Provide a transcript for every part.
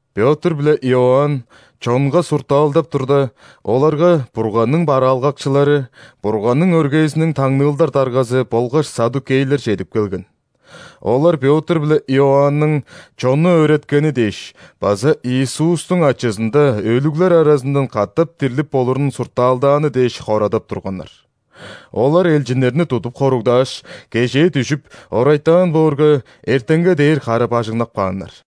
Пётр биле Иоанн чонга суртаалдап турда, оларга Бурганның бараалгакчылары, Бурганның өргээзиниң таңныылдар даргазы болгаш ·саддукейлер чедип келген. Олар Пётр биле Иоанның чонну өөреткени дээш база Иисустуң ачызында өлүглер аразындан катап дирлип болурун суртаалдааны дээш хорадап турганнар. Олар элчиннерни тудуп хоругдааш, кежээ дүжүп, орайтаан боорга, эртенге дээр кара-бажыңнап кааннар.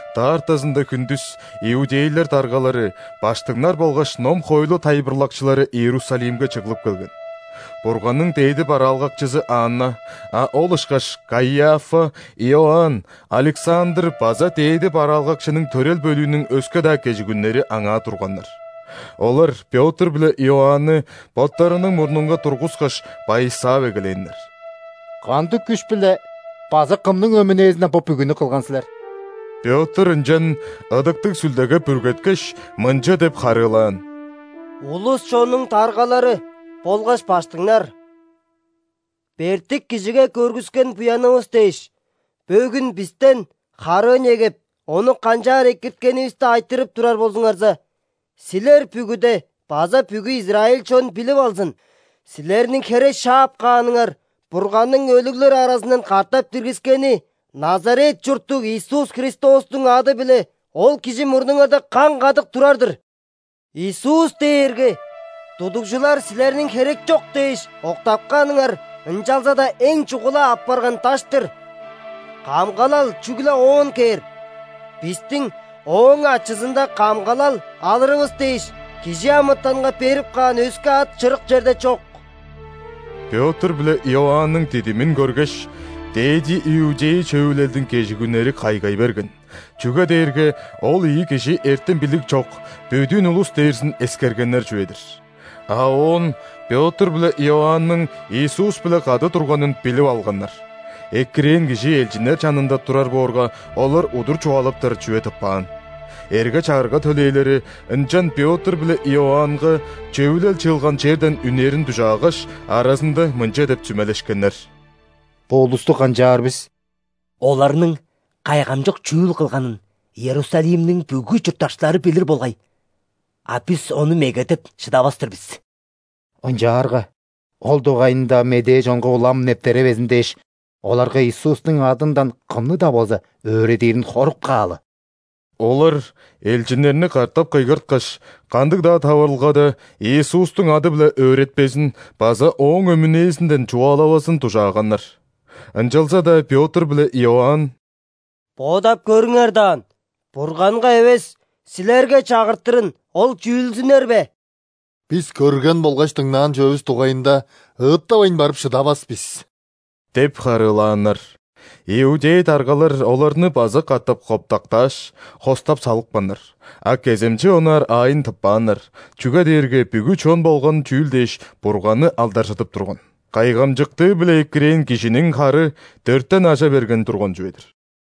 Даартазында хүндүс иудейлер даргалары, ·баштыңнар болгаш ном-хоойлу тайылбырлакчылары Иерусалимге чыглып келген. Бурганның дээди бараалгакчызы Анна, а ол ышкаш Каиафа, Иоанн, Александр база дээди бараалгакчының төрел бөлүүнүң өске-даа кежигүннери аңаа турганнар. Олар Пётр биле Иоанны боттарының мурнунга тургускаш, байысаап эгелээннер: «Кандыг күш-биле база кымның өмүнээзинден бо бүгүнү кылган силер?» Пётр ынчан, Ыдыктыг Сүлдеге бүргеткеш, мынча деп харыылаан: «Улус-чоннуң даргалары болгаш ·баштыңнар! Бертик кижиге көргүскен буянывыс дээш, бөгүн бистен харыы негеп, ону канчаар экирткенивисти айтырып турар болзуңарза, силер бүгүде база бүгү израиль чон билип алзын: силерниң хере шаап кааныңар, Бурганның өлүглер аразындан катап диргискени Назарет чурттуг Иисус Христостуң ады-биле ол кижи мурнуңарда каң-кадык турар-дыр! Иисус дээрге тудугжулар силерниң херекчок дээш, октапканыңар, ынчалза-даа эң чугула апарган даш-тыр. Камгалал чүгле Оон кээр, бистиң ооң ачызында камгалал алырывыс дээш, кижи амытанга берип каан өске ат чырык черде чок». Пётр биле Иоанның дидимин көргеш, ·дээди иудей Чөвүлелдиң кежигүннери кайгай берген, чүге дээрге ол ийи кижи эртем-билиг чок, бөдүүн улус дээрзин эскергеннер чүве-дир. А оон Пётр биле Иоанның Иисус-биле кады турганын билип алганнар. Экирээн кижи элчиннер чанында турар боорга, олар удур чугаалаптар чүве тыппаан. Эрге-чагырга төлээлери ынчан Пётр биле Иоаннга Чөвүлел чыылган черден үнерин дужаагаш, аразында мынча деп сүмелешкеннер: «Бо улусту канчаар бис? Оларның кайгамчык чүүл кылганын Иерусалимниң бүгү чурттакчылары билир болгай, а бис ону меге деп шыдавас-тыр бис. Ынчаарга ол дугайында медээ чонга улам нептеревезин дээш, оларга Иисустуң адындан кымны-даа болза өөредирин хоруп каалы». Олар элчиннерни катап кыйгырткаш, кандыг-даа таварылгада Иисустуң ады-биле өөретпезин база Ооң өмүнээзинден чугаалавазын дужааганнар. Ынчалза-даа Пётр биле Иоанн: «Бодап көрүңер даан, Бурганга эвес, силерге чагыртырын Ол чүүлзүнер бе? Бис көрген болгаш дыңнаан чүвевис дугайында ыыттавайн барып шыдавас бис» – деп харыылааннар. Иудей даргалар оларны база катап котпактааш, хостап салыпканнар, а кеземче онаар аайын тыппааннар, чүге дээрге бүгү чон болган чүүл дээш Бурганны алдаржыдып турган. Кайгамчыктыы-биле экирээн кижиниң хары дөртен ажа берген турган чүве-дир.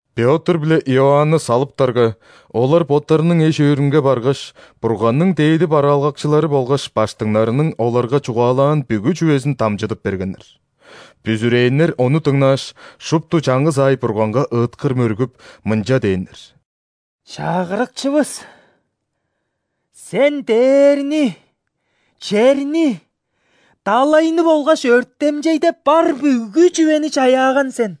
Пётр биле Иоанны салыптарга, олар боттарының эш-өөрүнге баргаш, Бурганның дээди бараалгакчылары болгаш ·баштыңнарның оларга чугаалаан бүгү чүвезин дамчыдып бергеннер. Бүзүрээннер ону дыңнааш, шупту чаңгыс аай Бурганга ыыткыр мөргүп, мынча дээннер: «Чагырыкчывыс! Сен дээрни, черни, далайны болгаш өртемчейде бар бүгү чүвени чаяаган сен!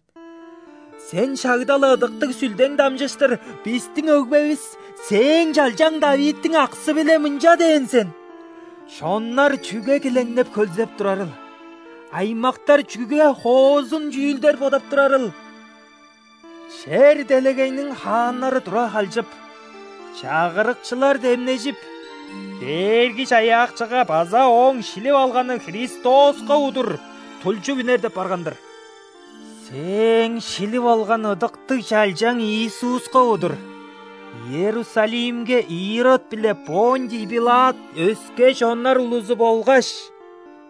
Сен шагда-ла Ыдыктыг Сүлдең дамчыштыр бистиң өгбевис, Сээң чалчаң ·Давидтиң аксы-биле мынча дээн сен:„Чоннар чүге килеңнеп хөлзеп турарыл,аймактар чүге хоозун чүүлдер бодап турарыл? Чер-делегейниң хааннары тура халчып, чагырыкчылар демнежип,Дээрги-Чаяакчыга база Ооң шилип алганы Христоска удуртулчуп үнер деп барган-дыр“. Сээң шилип алган Ыдыктыг Чалчаң Иисуска удур Иерусалимге Ирод биле ·Понтий Пилат өске чоннар улузу болгаш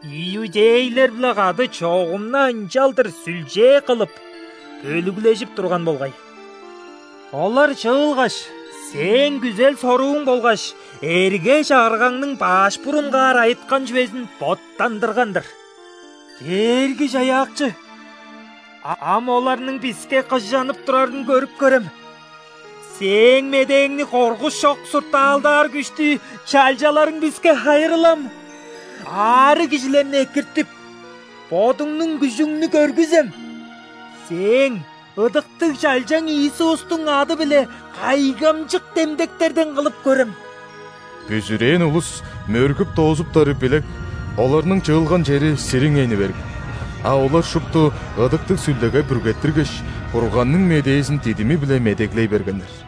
иудейлер-биле кады чогум-на ынчалдыр сүлчээ кылып, бөлүглежип турган болгай. Олар чыылгаш, Сээң күзел-сорууң болгаш эрге-чагыргаңның баш бурунгаар айыткан чүвезин боттандырган-дыр. Дээрги-Чаяакчы, а ам оларның биске кыжанып турарын көрүп көрем. Сээң медээңни коргуш чок суртаалдаар күштү чалчаларың биске хайырлам. Аарыг кижилерни экиртип, Бодуңнуң күжүңнү көргүзем, Сээң ыдыктыг Чалчаң Иисустуң ады-биле кайгамчык демдектерден кылып көрем!» Бүзүрээн улус мөргүп доозуптары билек, оларның чыылган чери сириңейни берген, а олар шупту Ыдыктыг Сүлдеге бүргеттиргеш, Бурганның медээзин дидими-биле медеглей бергеннер.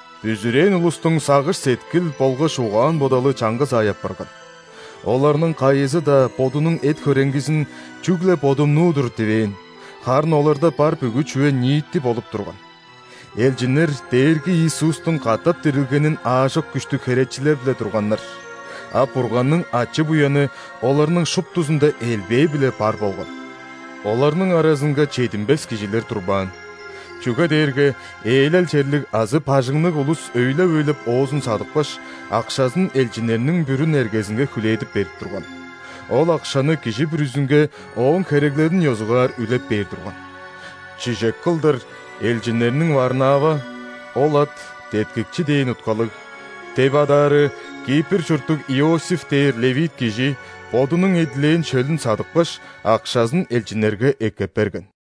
Бүзүрээн улустуң сагыш-сеткил болгаш угаан-бодалы чаңгыс аай апарган. Оларның кайызы-даа бодунуң эт-хөреңгизин «Чүгле бодумнуу-дур» дивээн, харын оларда бар бүгү чүве ниити болуп турган. Элчиннер Дээрги Иисустуң катап дирилгенин аажок күштүг херечилеп-ле турганнар, а Бурганның ачы-буяны оларның шуптузунда элбээ-биле бар болган. Оларның аразынга чединмес кижилер турбаан, чүге дээрге ээлел черлиг азы бажыңныг улус өйлеп-өйлеп оозун садыпкаш, акшазын элчиннерниң бүрүн эргезинге хүлээдип берип турган. Ол акшаны кижи бүрүзүнге ооң хереглелин ёзугаар үлеп бээр турган. Чижек кылдыр элчиннерниң Варнава (ол ат «Деткикчи» дээн уткалыг) деп адаары, Кипр чурттуг Иосиф дээр ·левит кижи бодунуң эдилээн шөлүн садыпкаш, акшазын элчиннерге эккеп берген.